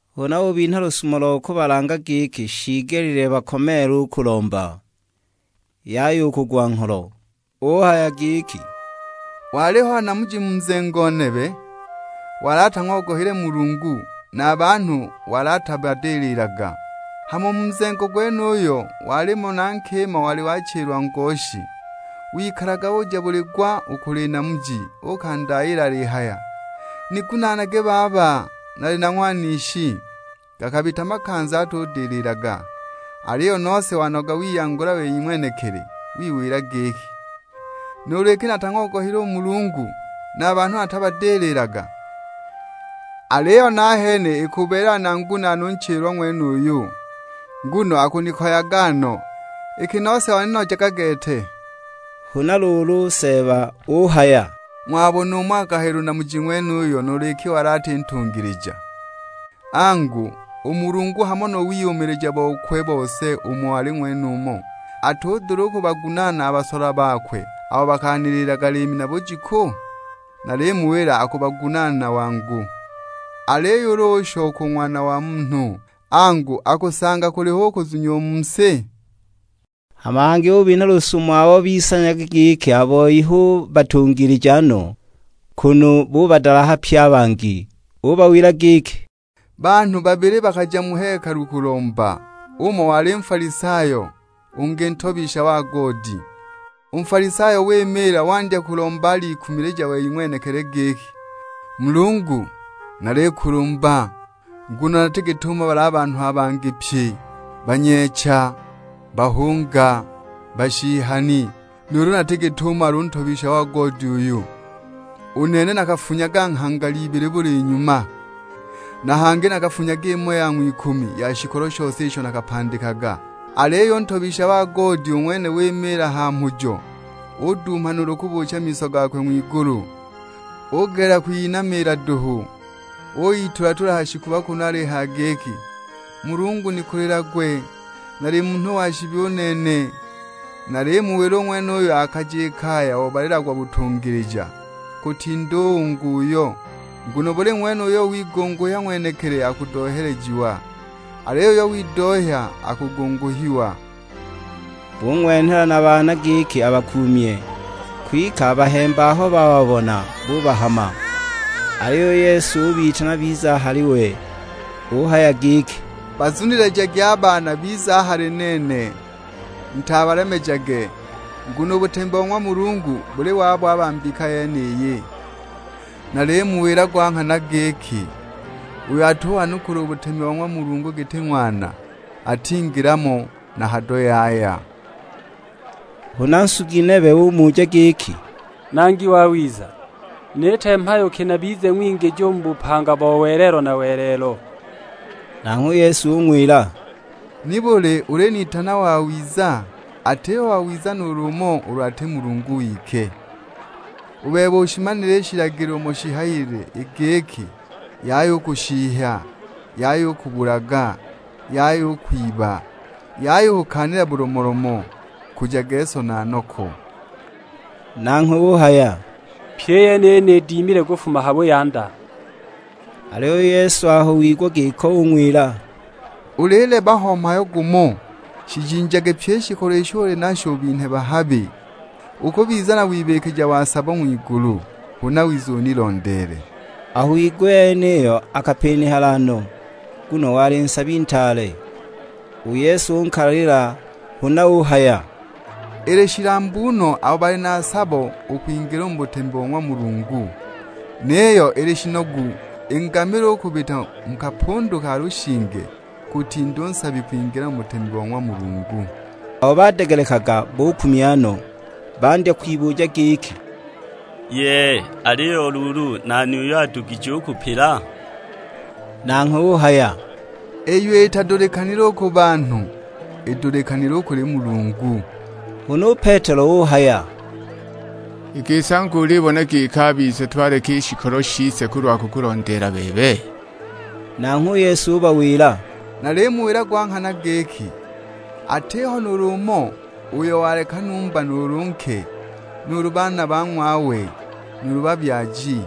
Huna ubinha lusumo lo kubalanga giki shiigelile bakomeele u kulomba, yaya u kugwa ngholo. Uhaya giki, "Waliho namuji mu nzengo nebe, wali atang'ogohile Mulungu; na a banhu wali atabadililaga. Hama u mu nzengo gwenuyo walimo na nkima wali wachilwa ngoshi; wikalaga uja buli gwa u kuli namuji okandayiila alihaya, 'Nigunaanage baba nali na ng'wanishi!' Gakabita makanza atudililaga, aliyo nose wanoga wiyangula wei ng'wenekili. Wiwila giki, 'Nuulu iki natang'ogohile u Mulungu, na a banhu natabadililaga, aliyo nahene ikubeelela nangunaane u nchilwa ng'wenuyu, nguno akunikoyaga no; iki nose waninojaga gete!' " Huna luulu, u Seeba uhaya, "Ng'wabona umo akahayila u namuji ng'wenuyo nuulu iki wali ati ntungilija? Angu, u Mulungu hamo na wiyumilija bokwe u bose umo ali ng'wenumo, atudula u kubagunaana a basolwa bakwe abo bakaniliilaga liimi na bujiku? Nalimuwila akubagunaana wangu. Aliyo ulu ushoka u Ng'wana wa Munhu, angu, akusanga kuliho u kuzunya u mu si?" Hama hangi ubinha lusumo abo bisanyaga giki a boi hu batungilija no, kunu bubadalaha pye a bangi. Ubawila giki, "Banhu babili bakaja mu hekalu kulomba, umo wali Nfalisayo, ungi ntobisha wa goodi. U Nfalisayo wimiila wandya kulomba alikumilija wei ng'wenekili giki, 'Mulungu, nalikulumba, nguno nati git'umo bali a banhu a bangi pye: banyeecha, bahunga, bashihani; nuulu nati git'umo ali u ntobisha wa goodi uyu! U nene nakafungaga nghangala ibili buli nyuma, na hangi nakafunyaga imo ya ng'wikumi ya shikolo shose isho nakapandikaga!' Aliyo u ntobisha wa goodi u ng'wene wimiila ha mhujo, uduuma nuulu kubuucha miso gakwe ng'wigulu. Ugelela kwiyinamiila duhu, uyitula-tula ha shikuba kunu alihaya giki, 'Mulungu nikulilagwe, nali munhu wa shibi u nene!' Nalimuwila u ng'wenuyo akaja i kaya obalilagwa butungilija, kutinda u ungi uyo; nguno buli ng'wene uyo wigunguhya ng'wenekili akudohelejiwa, aliyo uyo widohya akugunguhiwa." Bung'wenhela na baana giki abakuumye, kwike a bahemba aho bababona bubahama! Aliyo u Yesu ubitana bize a hali we; uhaya giki, "Bazunilijagi a baana bize a hali nene, mutabalemejage; nguno u butemi bo ng'wa Mulungu buli wabo a ba mbika yeniyi. Nalimuwila gwa nghana giki uyo atuwanukula u butemi bo ng'wa Mulungu giti ng'wana, atingila mo na hado yaya!" Huna nsugi nebe umuja giki, "Nangi wawiza, niite mhayo ki nabize ng'wingiji u mu bupanga bo welelo na welelo?" Nanghwe u Yesu ung'wila, "Nibuli ulinitana wawiza? Atiho wawiza nuulu umo ulu ati Mulungu wike! U bebe ushimanile i shilagilo umo shihayilile; i giki, 'Yaya u kushihya, Yaya u kubulaga, Yaya u kwiba, Yaya u kukaanila bulomolomo, Nkujage so na noko.' " Nanghwe uhaya, "Pyi i yeniyi nidimile kufuma ha buyanda!" Aliyo u Yesu aho wigwa giko ung'wila, "Ulileba ho mhayo gumo, shijinjage pyi i shikolo isho uli nasho ubinhe bahabi, ukubiza na wibikija wa sabo ng'wigulu, huna wize unilondeele." Aho wigwa i yeniyo akapinihala no, nguno wali nsabi ntaale. U Yesu unkalalila; huna uhaya, "Ili shilambu no abo bali na sabo u kwingila u mu butemi bo ng'wa Mulungu! Niyo ili shinogu i ngamila u kubita mu kapundu ka lushinge, kutinda u nsabi u kwingila mu butemi bo ng'wa Mulungu!" Abo badegelekaga bukumya no, bandya kwibuja giki, "Yee! Aliyo luulu nani uyo adugije u kupila?" Nanghwe uhaya, "Iyo itadulikanile u ku banhu, idulikanile u kuli Mulungu." Huna u Petelo uhaya, "I gisi angu ulibona giki a bise twaleka i shikolo shise kulwa kukulondeela bebe!" Nanghwe u Yesu ubawila, "Nalimuwila gwa nghana giki, atiho nuulu umo uyo waleka numba nuulu nke, nuulu baana ba ng'wawe, nuulu babyaji,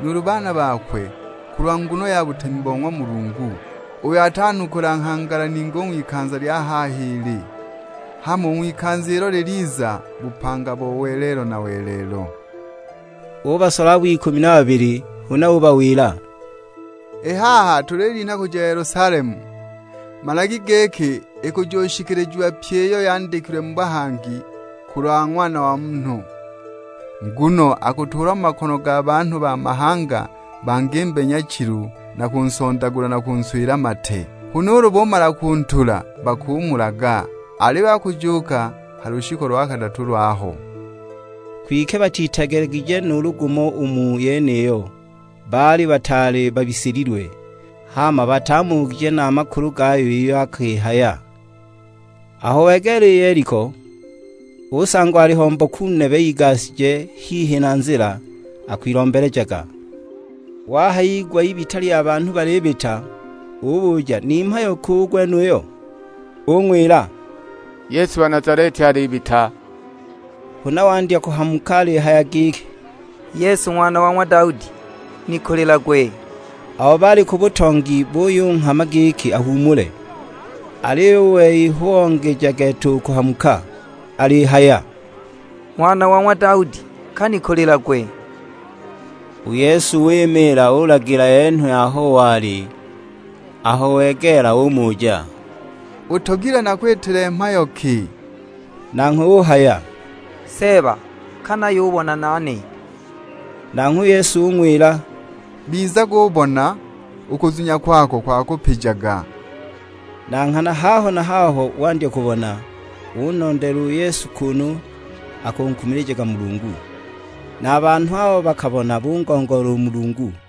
nuulu baana bakwe kulwa nguno ya butemi bo ng'wa Mulungu, uyo atanukula nghangala ningi u ng'wikanza lya haha ili, hama u ng'wikanza ilo liliza bupanga bo welelo na welelo." Ubasola abo ikumi na babili, huna ubawila; "I haha tulilinha kuja Yelusalemu, managi giki ikujushikilijiwa pyi iyo yandikilwe mu bahangi kulwa Ng'wana wa Munhu. Nguno akutuulwa mu makono ga banhu ba mahanga bangimbe nyachilu na kunsondagula na kunswila mate. Huna ulu bumala kuntula bakumulaga, aliyo akujuuka ha lushiku lo kadatu lwaho." Kwike batitegelegije nuulu gumo u mu yeniyo, baali bataali babisililwe; hama batamugije na a makulu gayo iyo akihaya. Aho wegeela i Yeliko, usangwa aliho mboku nebe igashije hihi na nzila, akwilombelejaga. Wahayigwa ibita lya banhu balibita, ubuja ni mhayo ki u gwenuyo. Bung'wila, "Yesu wa Nazaleti alibita." Huna wandya kuhamuka alihaya giki, "Yesu Ng'wana wa ng'wa Daudi, nikulilagwe!" Abo baali ku butongi buyunghama giki ahuumule, aliyo u wei hu ongeja gete u kuhamuka; alihaya, "Ng'wana wa ng'wa Daudi, ka nikulilagwe!" U Yesu wimiila ulagila enhwe aho wali; aho wegeela umuja, "Utogilwe nakwitile mhayo ki?" Nanghwe uhaya; "Seeba, ka nayubona nane!" Nanghwe u Yesu ung'wila, "Bizagubona, u kuzunya kwako kwakupijaga." Na nghana haho na haho wandya kubona, unondeela u Yesu kunu akunkumilijaga Mulungu. Na a banhu abo bakabona bungongoola u Mulungu.